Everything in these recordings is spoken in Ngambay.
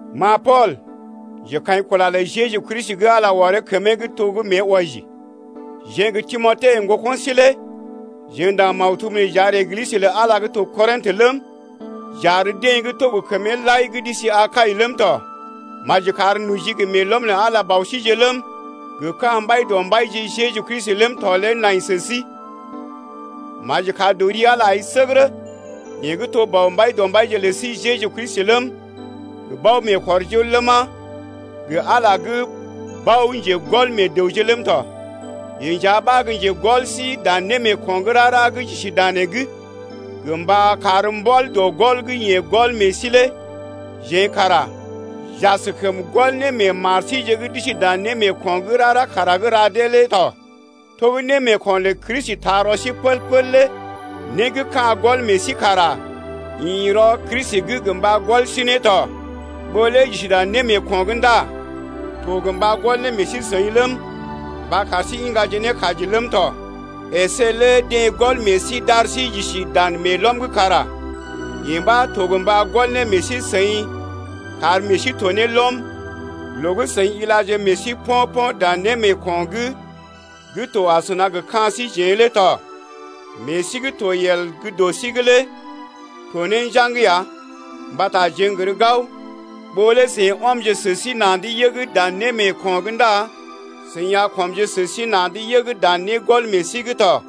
Ma Pool, njekaḭkula lə Jeju Kristi gə́ Ala ɔree kəmee’g to gə́ mée wɔji, jeḛ gə Timote, ŋgoko̰ sí lé jeḛ ndaŋg maktub nee j’ar Eglisə lə Ala gə́ to Korintə ləm, j’ar deḛ gə́ to gə kəmee lai gə́ d’isi Akai ləm tɔ. Maji kar noji gə meelɔm lə Ala Bɔ síje ləm, gə ka̰ Mbaidɔmbaije Jeju Kristi ləm tɔ lé nai sə sí. Maji kar dɔ ri Ala lé ai səgərə, yeḛ gə́ to Bɔ Mbaidɔmbaije lə sí Jeju Kristi ləm, gə bao-meekɔrjol ləma, gə Ala gə́ bao-njegɔl meḛ dəwje ləm tɔ. Yeḛ nja ɓa gə́ njegɔl sí dan némeeko̰ gə́ rara gə́ j’isi danee’g gə mba kar mbɔl dɔ gɔl gə́ yeḛ gɔl meḛ sí lé jeḛ kara j’askəm gɔl ne meḛ mar síje gə́ d’isi dan némeeko̰’g gə́ rara kara gə́ ra dee lé tɔ. To gə́ némeeko̰ lə Kristi taa rɔ sí pəl-pəl lé né gə́ ka̰ gɔl meḛ sí kara ḭ rɔ Kristi’g gə mba gɔl sí ne tɔ. Ɓó lé j’isi dan némeeko̰’g ndá to gə mba gɔl ne meḛ sí-seḭ ləm, mba kar sí iŋgaje ne kaji ləm tɔ. Esé lé deḛ gɔl meḛ sí d’ar sí j’isi dan meelɔm’g kara yee ɓa to gə mba gɔl ne meḛ sí-seḭ kar meḛ sí to ne lɔm loo gə́ seḭ ilaje meḛ sí po̰-po̰ dan némeeko̰’g gə́ to asəna gə ka̰ síjeḛ lé tɔ. Meḛ sí gə́ to yel gə́ dɔ sí’g lé to ne njaŋg ya mbata jeḛ n’gər gao ɓó lé seḭ ɔmje sə sí na̰’d yəg dan némeeko̰’g ndá seḭ a kɔmje sə sí na̰’d yəg dan négɔl meḛ sí’g tɔ.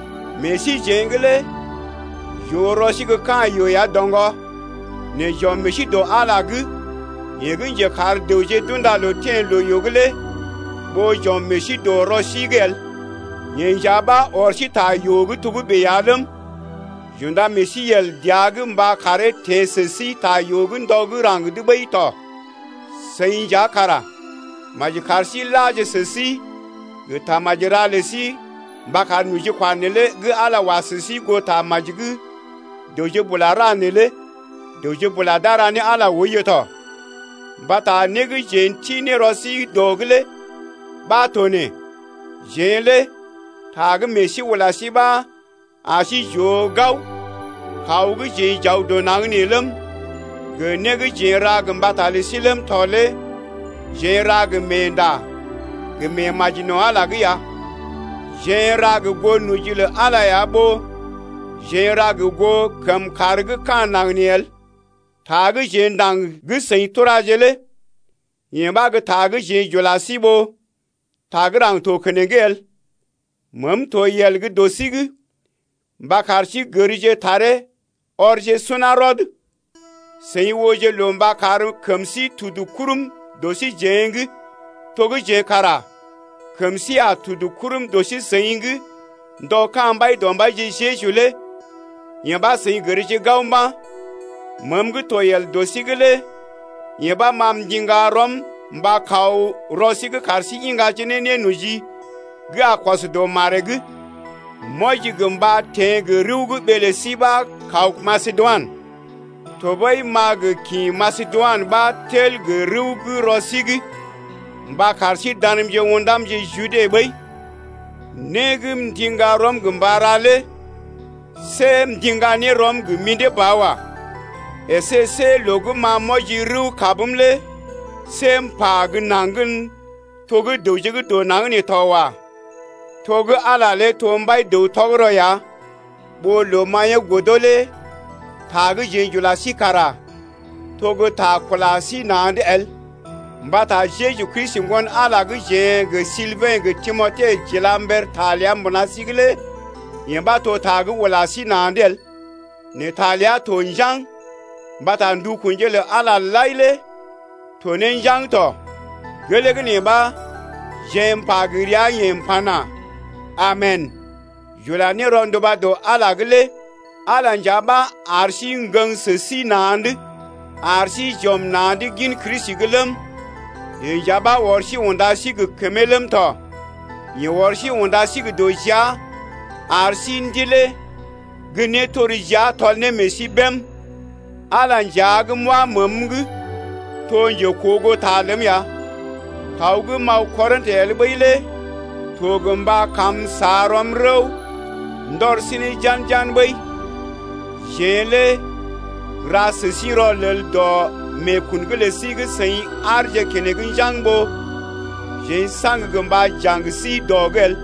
Meḛ síjeḛ’g lé j’oo rɔ sí gə́ ka̰ yoo ya doŋgɔ. Nɛ j’ɔm meḛ sí dɔ Ala’g yeḛ gə́ njekar dəwje d’unda loo teḛ loo-yoo’g lé ɓó j’ɔm meḛ sí dɔ rɔ sí’g el. Yeḛ nja ɓa ɔr sí ta yoo gə́ togə́bè ya ləm, j’unda meḛ sí yel dəa’g mba karee teḛ sə sí ta yoo’g ndɔ gə́ raŋg’d ɓəi tɔ. Seḭ nja kara maji kar sí laje sə sí gə tamaji ra lə sí mba kar nojikwa neelé gə́ Ala wa sə sí goo tamaji gə́ dəwje bula ra neelé dəwje bula d’a ra ne Ala oiyo tɔ. Mbata né gə́ jeḛ n’ti ne rɔ sí dɔ’g lé ɓa to nee: Jeḛ lé ta gə́ meḛ sí ula sí ɓa ar sí j’oo gao kaw gə́ jeḛ j’aw dɔ naŋg nee ləm, gə né gə́ jeḛ n’ra gə mbata lə sí ləm tɔ lé jeḛ n’ra gə meenda gə meemaji no̰ Ala’g ya: jeḛ n’ra gə goo noji lə Ala ya ɓó jeḛ n’ra gə goo kəmkàr gə́ ka̰ naŋg nee el. Ta gə́ jeḛ ndaŋg gə́ seḭ turaje lé yee ɓa gə́ ta gə́ jeḛ j’ula sí ɓó ta gə́ raŋg to keneŋ el. Meem to yel gə́ dɔ sí’g mba kar sí gərje taree ɔrje suná rɔd. Seḭ ooje loo mba kar kəm sí tudu kurm dɔ síjeḛ’g, to gə́ jeḛ kara kəm sí a tudu kurm dɔ sí seḭ’g ndɔ ka̰ Mbaidɔmbaije Jeju lé. Yee ɓa seḭ gərje gao mba̰. Meem gə́ to yel gə́ dɔ sí’g lé yee ɓa ma m’ndiŋga ne rɔm mba kaw rɔ sí’g kar sí iŋgaje ne nénoji gə́ a kɔs dɔ maree’g. M’wɔji gə mba teḛ gə rəw gə́ ɓee lə sí ɓa kaw Masedoinə, tɔɓəi m’a gə kḭ Masedoinə ɓa tel gə rəw gə́ rɔ sí’g mba kar sí danmje ṵdamje Jude ɓəi. Né gə́ m’ndiŋga rɔm gə mba ra lé see m’ndiŋga ne rɔm gə mḭdé ba wa. Esé see loo gə́ ma m’wɔji rəw-kabm lé see m’pa gə́ naŋg’n to gə́ dəwje gə́ dɔ naŋg nee tɔ wa. To gə́ Ala lé to mbai-dəw tɔgərɔ ya ɓó loo maḭyee godo lé ta gə́ jeḛ j’ula sí kara to gə́ ta kula sí na̰’d el. Mbata Jeju Kristi, Ŋgon-Ala gə́ jeḛ gə Silbɛ̰ gə Timote j’ila mber ta ləa mbuna sí’g lé yee ɓa to ta gə́ ula sí na̰’d el nɛ ta ləa to njaŋg. Mbata ndukunje lə Ala lai lé to ne njaŋg tɔ. Gelee gə́ nee ɓa jeḛ m’pa gə ria-yeḛ m’pana: Amen, j’ula ne rɔnduba dɔ Ala’g lé. Ala nja ɓa ar sí ŋgəŋ sə sí na̰’d ar sí j’ɔm na̰’d gin Kristi’g ləm, yeḛ nja ɓa ɔr sí unda sí gə kəmee ləm tɔ. Yeḛ ɔr sí unda sí gə dɔ jia ar sí ndilee gə́ nétorjia tɔl ne meḛ sí bém. Ala nja gə́ m’wa məəm’g to njekoogoo ta ləm ya: kaw gə́ m’aw Korintə el ɓəi lé to gə mba m’sa rɔm rəw ndɔr sí ne jan-jan ɓəi. Jeḛ lé n’ra sə sí rɔlel dɔ meekun’g lə sí gə́ seḭ aarje keneŋ njaŋg ɓó jeḛ saŋg gə mba jaŋ sí dɔ’g el.